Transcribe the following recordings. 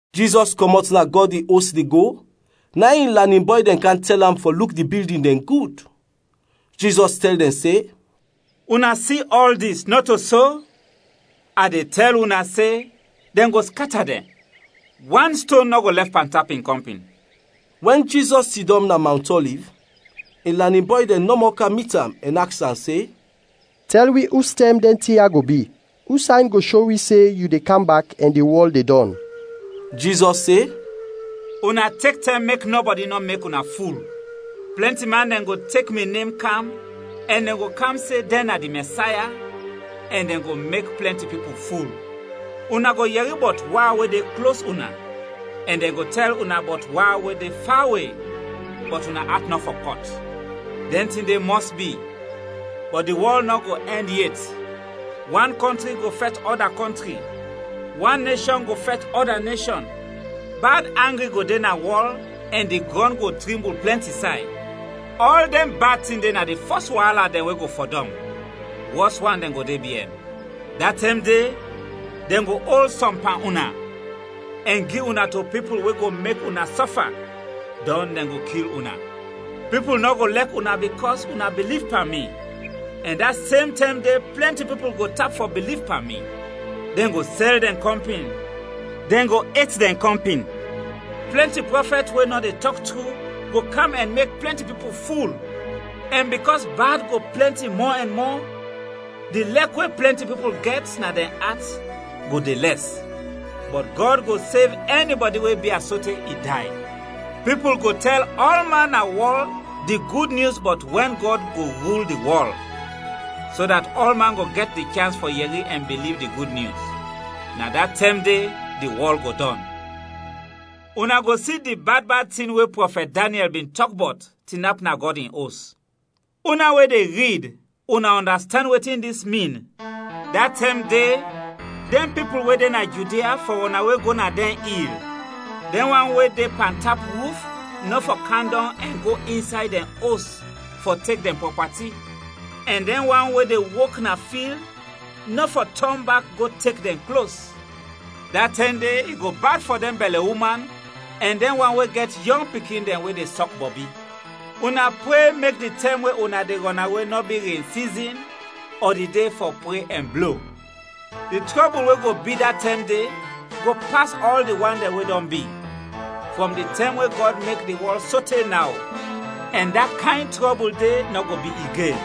Jizɔs kɔmɔt na Gɔd in Os de go, na in in lanin bɔy dɛn kam tɛl am fɔ luk di bildin dɛn gud. Jizɔs tɛl dɛn se, “Una si ɔl dis, nɔto so? A de tɛl una se, dɛn go skata dɛn, wan ston nɔ go lɛf pantap in kɔmpin.” Wɛn Jizɔs sidɔm na Mawnt Ɔliv, in lanin bɔy dɛn nɔmɔ kam mit am ɛn aks am se, “Tɛl wi ustɛm dɛn tin ya go bi, us sayn go sho wi se yu de kam bak ɛn di wɔl de dɔn?” Jizɔs se, “Una tek tɛm mek nɔbɔdi nɔ mek una ful. Plɛnti man dɛn go tek mi nem kam, ɛn dɛn go kam se dɛn na di Mɛsaya ɛn dɛn go mek plɛnti pipul ful. Una go yɛri bɔt wa we de klos una, ɛn dɛn go tɛl una bɔt wa we de fawe, bɔt una at nɔ fɔ kɔt. Dɛn tin de mɔs bi, bɔt di wɔl nɔ go ɛnd yet. Wan kɔntri go fɛt ɔda kɔntri; wan neshɔn go fɛt ɔda neshɔn; bad angri go de na wɔl ɛn di grɔn go trimbul plɛnti say. Ɔl dɛn bad tin de na di fɔs waala dɛn we go fɔdɔm. Wɔs wan dɛn go de biɛn. “Da tɛm de, dɛn go ol sɔm pan una, ɛn gi una to pipul we go mek una sɔfa, dɔn dɛn go kil una. Pipul nɔ go lɛk una bikɔs una biliv pan mi. Ɛn da sem tɛm de plɛnti pipul go tap fɔ biliv pan mi. Dɛn go sɛl dɛn kɔmpin, dɛn go et dɛn kɔmpin. Plɛnti prɔfɛt we nɔ de tɔk tru go kam ɛn mek plɛnti pipul ful. Ɛn bikɔs bad go plɛnti mɔ ɛn mɔ, di lɛk we plɛnti pipul gɛt na dɛn at go de lɛs. Bɔt Gɔd go sev ɛnibɔdi we bia sote i day. Pipul go tɛl ɔlman na wɔl di Gud Nyus bɔt wɛn Gɔd go rul di wɔl, so dat ɔlman go gɛt di chans fɔ yɛri ɛn biliv di Gud Nyus; na da tɛm de di wɔl go dɔn. “Una go si di bad bad tin we prɔfɛt Daniɛl bin tɔk bɔt, tinap na Gɔd in Os.” (Una we de rid: una ɔndastand wetin dis min!) “Da tɛm de, dɛn pipul we de na Judia fɔ rɔnawe go na dɛn il. Dɛn wan we de pantap ruf nɔ fɔ kam dɔng ɛn go insay dɛn os fɔ tek dɛn prɔpati; ɛn dɛn wan we de wok na fil nɔ fɔ tɔn bak go tek dɛn klos. Da tɛm de, i go bad fɔ dɛn bɛlɛ uman ɛn dɛn wan we gɛt yɔng pikin dɛn we de sɔk bɔbi! Una pre mek di tɛm we una de rɔnawe nɔ bi ren sizin ɔ di de fɔ pre ɛn blo! Di trɔbul we go bi da tɛm de go pas ɔl di wan dɛn we dɔn bi, frɔm di tɛm we Gɔd mek di wɔl sote naw, ɛn da kayn trɔbul de nɔ go bi igen.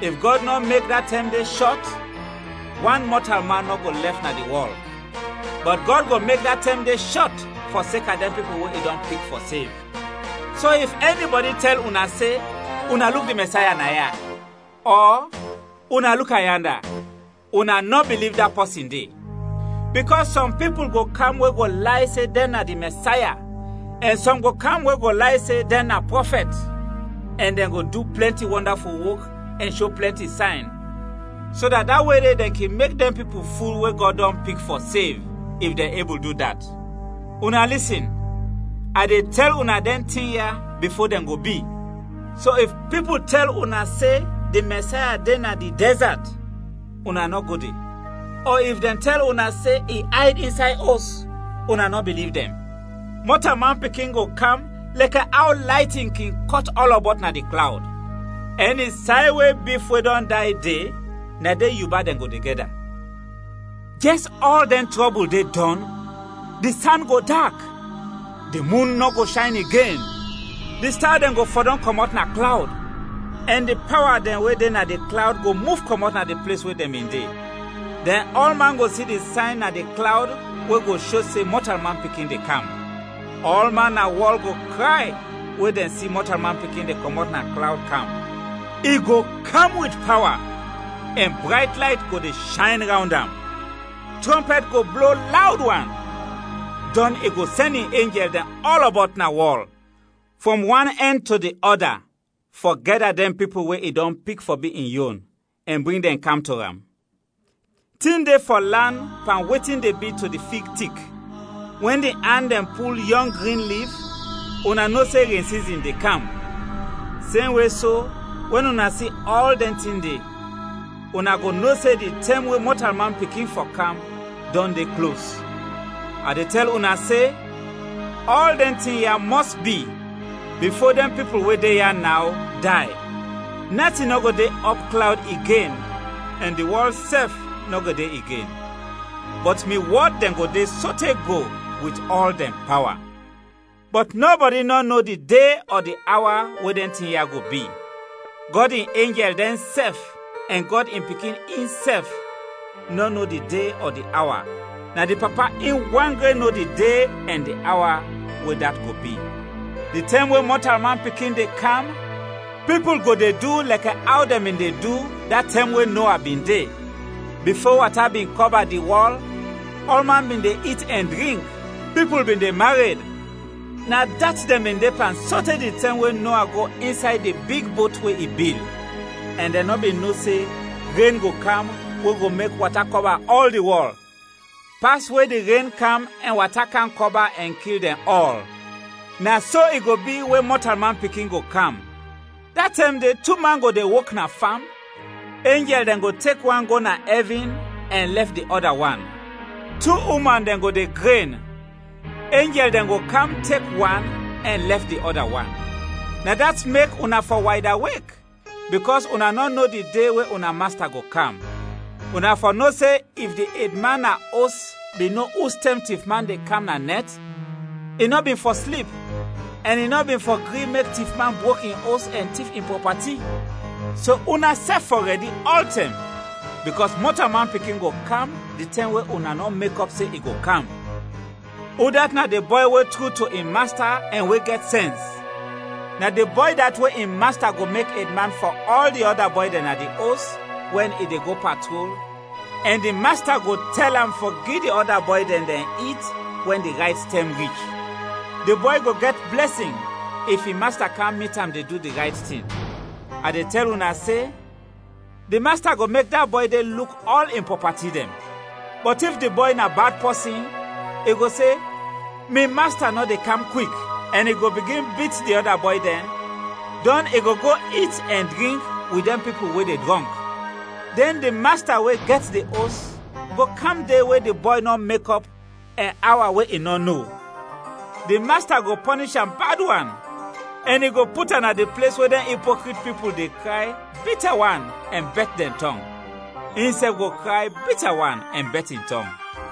If Gɔd nɔ mek da tɛm de shɔt, wan mɔtalman nɔ go lɛf na di wɔl; bɔt Gɔd go mek da tɛm de shɔt fɔseka dɛn pipul we i dɔn pik fɔ sev. “So if ɛnibɔdi tɛl una se, ‘Una luk di Mɛsaya naya!’ ɔ ‘Una luk am yanda!’ una nɔ biliv da pɔsin de. Bikɔs sɔm pipul go kam we go lay se dɛn na di Mɛsaya ɛn sɔm go kam we go lay se dɛn na prɔfɛt, ɛn dɛn go du plɛnti wɔndaful wok ɛn sho plɛnti sayn, so dat da we de dɛn kin mek dɛn pipul ful we Gɔd dɔn pik fɔ sev, if dɛn ebul du dat. Una lisin, a de tɛl una dɛn tin ya bifo dɛn go bi. “So if pipul tɛl una se di Mɛsaya de na di dɛzat, una nɔ go de; ɔ if dɛn tɛl una se i ayd insay os, una nɔ biliv dɛn. Mɔtalman Pikin go kam lɛkɛ aw laytin kin kɔt ɔlɔbɔt na di klawd. “Ɛni say we bif we dɔn day de, na de yuba dɛn de go gɛda. “Jɛs ɔl dɛn trɔbul de dɔn, di san go dak, di mun nɔ go shayn igen, di sta dɛn go fɔdɔm kɔmɔt na klawd, ɛn di pawa dɛn we de na di klawd go muf kɔmɔt na di ples we dɛn bin de. Dɛn ɔlman go si di sayn na di klawd we go sho se Mɔtalman Pikin de kam. Ɔlman na wɔl go kray we dɛn si Mɔtalman Pikin de kɔmɔt na klawd kam. I go kam wit pawa, ɛn brayt layt go de shayn rawnd am. Trɔmpɛt go blo lawd wan, dɔn i go sɛn in enjɛl dɛn ɔlɔbɔt na wɔl frɔm wan ɛnd to di ɔda fɔ gɛda dɛn pipul we i dɔn pik fɔ bi in yon, ɛn bring dɛn kam to am. “Tin de fɔ lan pan wetin de bi to di fig tik. Wɛn di an dɛn pul yɔng grin lif, una no se ren sizin de kam. Semwe so, wɛn una si ɔl dɛn tin de, una go no se di tɛm we Mɔtalman Pikin fɔ kam dɔn de klos. A de tɛl una se, ɔl dɛn tin ya mɔs bi bifo dɛn pipul we de ya naw, day. Natin nɔ go de ɔpklawd igen ɛn di wɔl sɛf nɔ go de igen, bɔt mi wɔd dɛn go de sote go wit ɔl dɛn pawa. “Bɔt nɔbɔdi nɔ no di de ɔ di awa we dɛn tin ya go bi. Gɔd in enjɛl dɛnsɛf ɛn Gɔd in Pikin insɛf nɔ no di de ɔ di awa, na di Papa in wan gren no di de ɛn di awa we dat go bi. Di tɛm we Mɔtalman Pikin de kam, pipul go de du lɛkɛ aw dɛn bin de du da tɛm we Noa bin de. Bifo wata bin kɔba di wɔl, ɔlman bin de it ɛn drink; pipul bin de mared. Na dat dɛn bin de pan sote di tɛm we Noa go insay di big bot we i bil, ɛn dɛn nɔ bin no se ren go kam we go mek wata kɔba ɔl di wɔl, pas we di ren kam ɛn wata kam kɔba ɛn kil dɛn ɔl. Na so i go bi we Mɔtalman Pikin go kam. Da tɛm de, tu man go de wok na fam, enjɛl dɛn go tek wan go na ɛvin, ɛn lɛf di ɔda wan. Tu uman dɛn go de gren, enjɛl dɛn go kam tek wan ɛn lɛf di ɔda wan. “Na dat mek una fɔ waydawek, bikɔs una nɔ no di de we una Masta go kam. Una fɔ no se if di edman na os bin no ustɛm tifman de kam na nɛt, i nɔ bin fɔ slip, ɛn i nɔ bin fɔ gri mek tifman brok in os ɛn tif in prɔpati. So, unasɛf fɔ rɛdi ɔltɛm, bikɔs Mɔtalman Pikin go kam di tɛm we una nɔ mekɔp se i go kam. “Udat na di bɔy we tru to in masta ɛn we gɛt sɛns? Na di bɔy dat we in masta go mek edman fɔ ɔl di ɔda bɔy dɛn na di os, wɛn i de go patrol, ɛn di masta go tɛl am fɔ gi di ɔda bɔy dɛn, dɛn it wɛn di rayt tɛm rich. Di bɔy go gɛt blɛsin if in masta kam mit am de du di rayt tin. A de tɛl una se, di masta go mek da bɔy de luk ɔl in prɔpati dɛn. Bɔt if di bɔy na bad pɔsin, i go se, ‘Mi masta nɔ de kam kwik’, ɛn i go bigin bit di ɔda bɔy dɛn, dɔn i go go it ɛn drink wit dɛn pipul we de drɔnk. Dɛn di masta we gɛt di os go kam de we di bɔy nɔ mekɔp ɛn awa we i nɔ no. Di masta go pɔnish am bad wan, ɛn i go put am na di ples we dɛn ipokrit pipul de kray bita wan ɛn bɛt dɛn tɔng; insɛf go kray bita wan ɛn bɛt in tɔng.